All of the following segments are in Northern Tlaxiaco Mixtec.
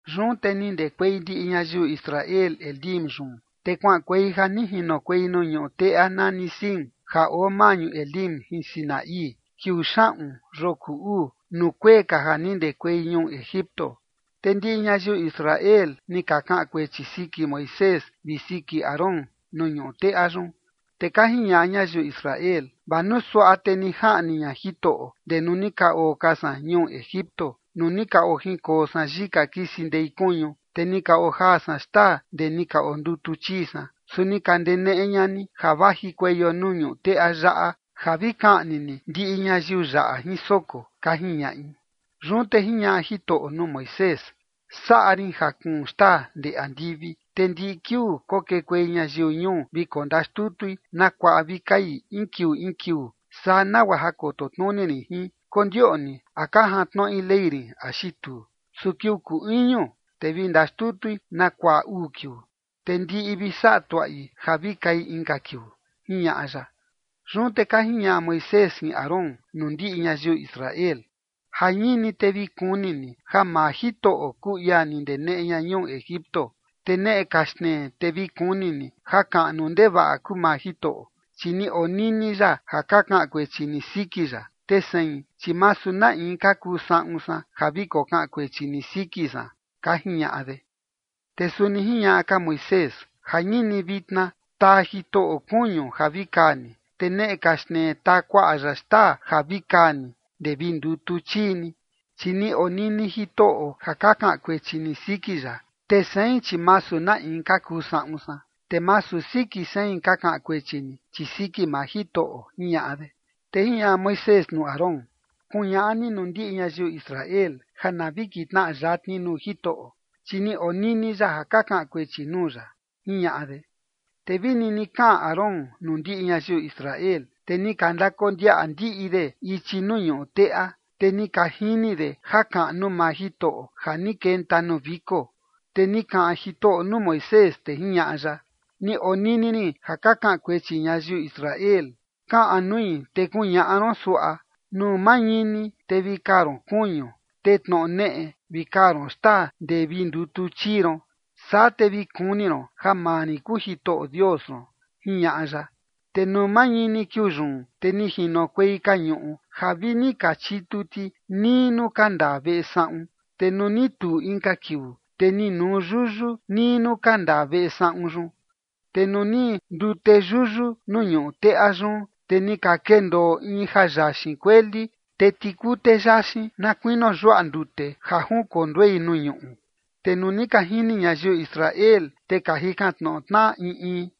Yun te ni ndekuei ndiꞌi ñayiu Israel Elim yun, te kuaꞌankuei ja ni jinokuei nuu ñuꞌu teꞌa nani Sin ja oo maꞌñu Elim jin Sinaí, kiuu xaꞌun yoo kuu uu, nuu kuee ka ja ni ndekuei ñuu Egipto. Te ndiꞌi ñayiu Israel ni ka kaꞌan kuechi siki Moisés vi siki Aarón nuu ñuꞌu teꞌa yun. Te ka jiñaꞌa ñayiu Israel: ―Vaa nuu suaꞌa te ni jaꞌni ña Jitoꞌo ndee nuu ni ka oo ka san ñuu Egipto nuu ni ka ojinkoo san yika kisi ndei kuñu, te ni ka ojaa san xtaa ndee ni ka ondutu chii san. Su ni ka ndeneꞌe ña ni ja vajikueio nuu ñuꞌu teꞌa yaꞌa ja vi kaꞌni ni ndiꞌi ñayiu yaꞌa jin soko ―ka jiñaꞌi. Yun te jiñaꞌa Jitoꞌo nuu Moisés: ―Saꞌa rin ja kuun xtaa ndee andivi, te ndiꞌi kiuu kokekuei ñayiu ñuu vi kondaxtutui na kuaꞌa vi kai in kiuu in kiuu. Saa nagua ja koto tnuni rin jin, kondioꞌni a ka jantnoꞌi ley rin axi tuu. Su kiuu kuu iñu, te vi ndaxtutui na kuaꞌa uu kiuu, te ndiꞌi vi saꞌa tuaꞌi ja vi kai inka kiuu ―jiñaꞌa ya. Yun te ka jiñaꞌa Moisés jin Aarón nuu ndiꞌi ñayiu Israel: ―Jañini te vi kuni ni ja maa Jitoꞌo kuu ia ni ndeneꞌe ña ñuu Egipto. Te neꞌe ka xtnee te vi kuni ni jakaꞌnu ndevaꞌa kuu maa Jitoꞌo, chi ni onini ya ja ka kaꞌan kuechi ni siki ya. Te sein, chi masu na in ka kuu saꞌun san ja vi kokaꞌan kuechi ni siki san ―ka jiñaꞌa de. Te suni jiñaꞌa ka Moisés: ―Jañini vitna taa Jitoꞌo kuñu ja vi kaa ni, te neꞌe ka xtnee taa kuaꞌa ya xtaa ja vi kaa ni ndee vi ndutu chii ni, chi ni onini Jitoꞌo ja ka kaꞌan kuechi ni siki ya. Te sein chi masu na in ka kuu saꞌun san, te masu siki sein ka kaꞌan kuechi ni, chi siki maa Jitoꞌo ―jiñaꞌa de. Te jiñaꞌa Moisés nuu Aarón: ―Kuñaꞌa ni nuu ndiꞌi ñayiu Israel ja na vi kitnaꞌa yatni nuu Jitoꞌo, chi ni onini ya ja ka kaꞌan kuechi nuu ya ―jiñaꞌa de. Te vi nini kaꞌan Aarón nuu ndiꞌi ñayiu Israel, te ni ka ndakondiaꞌa ndiꞌi de ichi nuu ñuꞌu teꞌa, te ni ka jini de jakaꞌnu maa Jitoꞌo ja ni kenta nuu viko. Te ni kaꞌan Jitoꞌo nuu Moisés, te jiñaꞌa ya: ―Ni onini rin ja ka kaꞌan kuechi ñayiu Israel. Kaꞌan nui te kuñaꞌa ron suaꞌa: “Nuu mañini te vi kaa ron kuñu, te tnoꞌo neꞌe vi kaa ron xtaa ndee vi ndutu chii ron. Saa te vi kuni ron ja maa rin kuu Jitoꞌo Dios ron”, jiñaꞌa ya. Te nuu mañini kiuu yun, te ni jinokuei kañuꞌu ja vi ni ka chitu ti nii nuu ka ndaa veꞌe saꞌun. Te nuu ni tuu inka kiuu, te ni nuu yuyu nii nuu ka ndaa veꞌe saꞌun yun. Te nuu ni ndute yuyu nuu ñuꞌu teꞌa yun, te ni ka kendoo in ja yaxin kueli, te tikute yaxin na kuinio yuaꞌa ndute ja junkonduei nuu ñuꞌu. Te nuu ni ka jini ñayiu Israel, te ka jikan tnoꞌo tnaꞌa in in: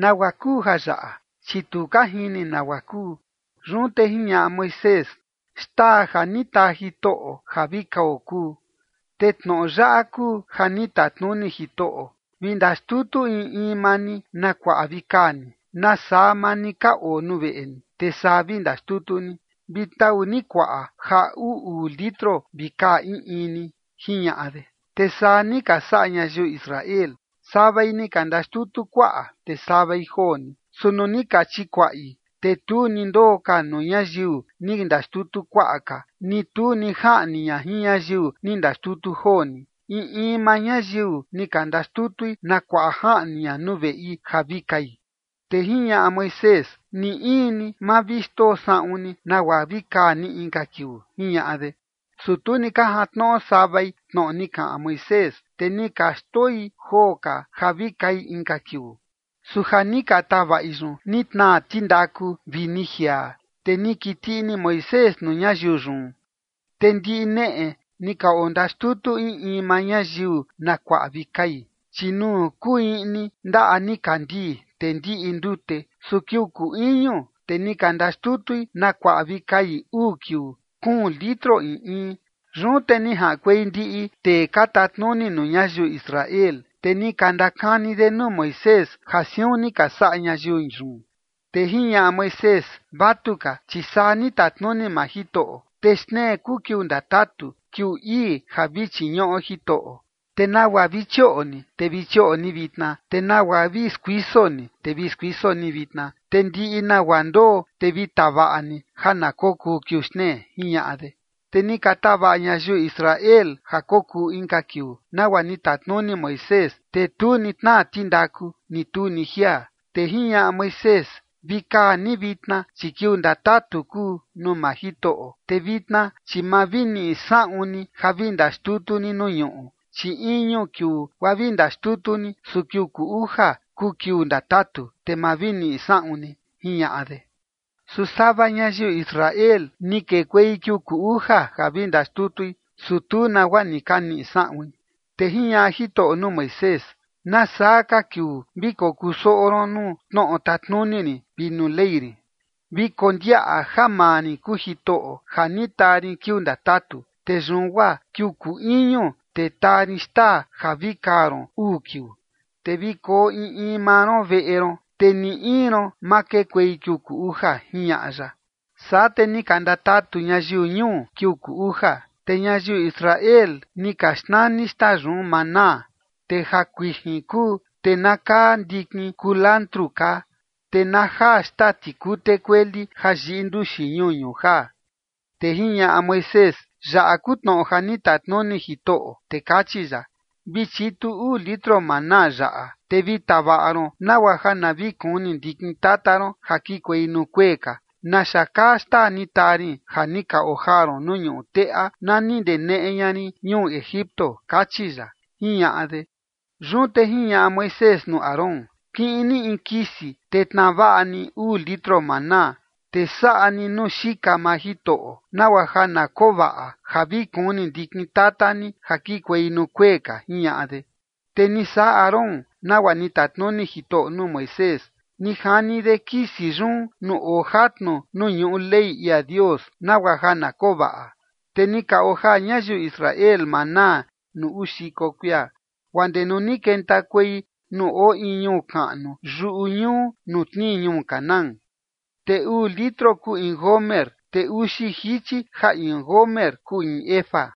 ―¿Nagua kuu jayaꞌa? ―Chi tu ka jini nagua kuu. Yun te jiñaꞌa Moisés: ―Xtaa ja ni taa Jitoꞌo ja vi kao kuu. Te tnoꞌo yaꞌa kuu ja ni tatnuni Jitoꞌo: Vi ndaxtutu in in maa ni na kuaꞌa vi kaa ni, nasaa maa ni ka oo nuu veꞌe ni, te saa vi ndaxtutu ni. Vi tau ni kuaꞌa ja uu uu litro vi kaa in in ni ―jiñaꞌa de. Te saa ni ka saꞌa ñayiu Israel. Savai ni ka ndaxtutu kuaꞌa, te savai joo ni. Su nuu ni ka chikuaꞌi, te tu ni ndoo ka nuu ñayiu ni ndaxtutu kuaꞌa ka, ni tu ni jaꞌni ña jin ñayiu ni ndaxtutu joo ni. In in maa ñayiu ni ka ndaxtutui na kuaꞌa jaꞌni ña nuu veꞌi ja vi kai. Te jiñaꞌa Moisés: ―Ni in ni ma vi xndoo saꞌun ni nagua vi kaa ni inka kiuu ―jiñaꞌa de. Su tu ni ka jantnoꞌo savai tnoꞌo ni kaꞌan Moisés, te ni ka xndoi joo ka ja vi kai inka kiuu. Su ja ni ka tavaꞌi yun ni tnaa tindaku vi ni jiaa, te ni kiti ini Moisés nuu ñayiu yun. Te ndiꞌi neꞌe ni ka ondaxtutu in in maa ñayiu na kuaꞌa vi kai, chi nuu kuu iꞌni ndaꞌa nikandii, te ndiꞌi ndute. Su kiuu kuu iñu, te ni ka ndaxtutui na kuaꞌa vi kai uu kiuu, kuun litro in in. Yun te ni jaꞌankuei ndiꞌi tee ka tatnuni nuu ñayiu Israel, te ni ka ndakani de nuu Moisés ja siun ni ka saꞌa ñayiu yun. Te jiñaꞌa Moisés: ―Vatuka, chi saa ni tatnuni maa Jitoꞌo: Te xtnee kuu kiuu ndatatu, kiuu ii ja vi chiñuꞌo Jitoꞌo. Te nagua vi chioꞌo ni, te vi chioꞌo ni vitna, te nagua vi skuiso ni, te vi skuiso ni vitna. Te ndiꞌi nagua ndoo, te vi tavaꞌa ni ja na kokuu kiuu xtnee ―jiñaꞌa de. Te ni ka tavaꞌa ñayiu Israel ja kokuu inka kiuu, nagua ni tatnuni Moisés, te tu ni tnaa tindaku, ni tu ni jiaa. Te jiñaꞌa Moisés: ―Vi kaa ni vitna, chi kiuu ndatatu kuu nuu maa Jitoꞌo, te vitna chi ma vi niꞌi saꞌun ni ja vi ndaxtutu ni nuu ñuꞌu. Chi iñu kiuu guaa vi ndaxtutu ni, su kiuu kuu uja kuu kiuu ndatatu, te ma vi niꞌi saꞌun ni ―jiñaꞌa de. Su sava ñayiu Israel ni kekuei kiuu kuu uja ja vi ndaxtutui, su tu nagua ni ka niꞌi saꞌuin. Te jiñaꞌa Jitoꞌo nuu Moisés: ―¿Nasaa ka kiuu vi kokusoꞌo ron nuu tnoꞌo tatnuni rin vi nuu Ley rin? Vi kondiaꞌa ja maa rin kuu Jitoꞌo ja ni taa rin kiuu ndatatu, te yun guaa kiuu kuu iñu, te taa rin xtaa ja vi kaa ron uu kiuu. Te vi koo in in maa ron veꞌe ron, te ni in ron ma kekuei kiuu kuu uja ―jiñaꞌa ya. Saa te ni ka ndatatu ñayiu ñuu kiuu kuu uja. Te ñayiu Israel ni ka xnani xtaa yun maná, te ja kuijin kuu, te na kaa ndikin kulantru kaa, te na jaa xtaa tikute kueli ja yiꞌi nduxi ñuñu jaa. Te jiñaꞌa Moisés: ―Yaꞌa kuu tnoꞌo ja ni tatnuni Jitoꞌo, te kachi ya: “Vi chitu uu litro maná yaꞌa, te vi tavaꞌa ron nagua ja na vi kuni ndikin tata ron ja kikuei nuu kuee ka naxa kaa xtaa ni taa rin ja ni ka ojaa ron nuu ñuꞌu teꞌa na ni ndeneꞌe ña rin ñuu Egipto”, kachi ya ―jiñaꞌa de. Yun te jiñaꞌa Moisés nuu Aarón: ―Kiꞌin ni in kisi te tnaa vaꞌa ni uu litro maná, te saꞌa ni nuu xika maa Jitoꞌo, nagua ja na koo vaꞌa ja vi kuni ndikin tata ni ja kikuei nuu kuee ka ―jiñaꞌa de. Te ni saꞌa Aarón nagua ni tatnuni Jitoꞌo nuu Moisés. Ni jani de kisi yun nuu oo jatnu nuu ñuꞌu ley ia Dios, nagua ja na koo vaꞌa. Te ni ka ojaa ñayiu Israel maná nuu uu xiko kuia, guaa ndee nuu ni kentakuei nuu oo in ñuu kaꞌnu yuꞌu ñuꞌu nuu tnii ñuu Canaán. Te uu litro kuu in gomer, te uxi jichi ja in gomer kuu in efa.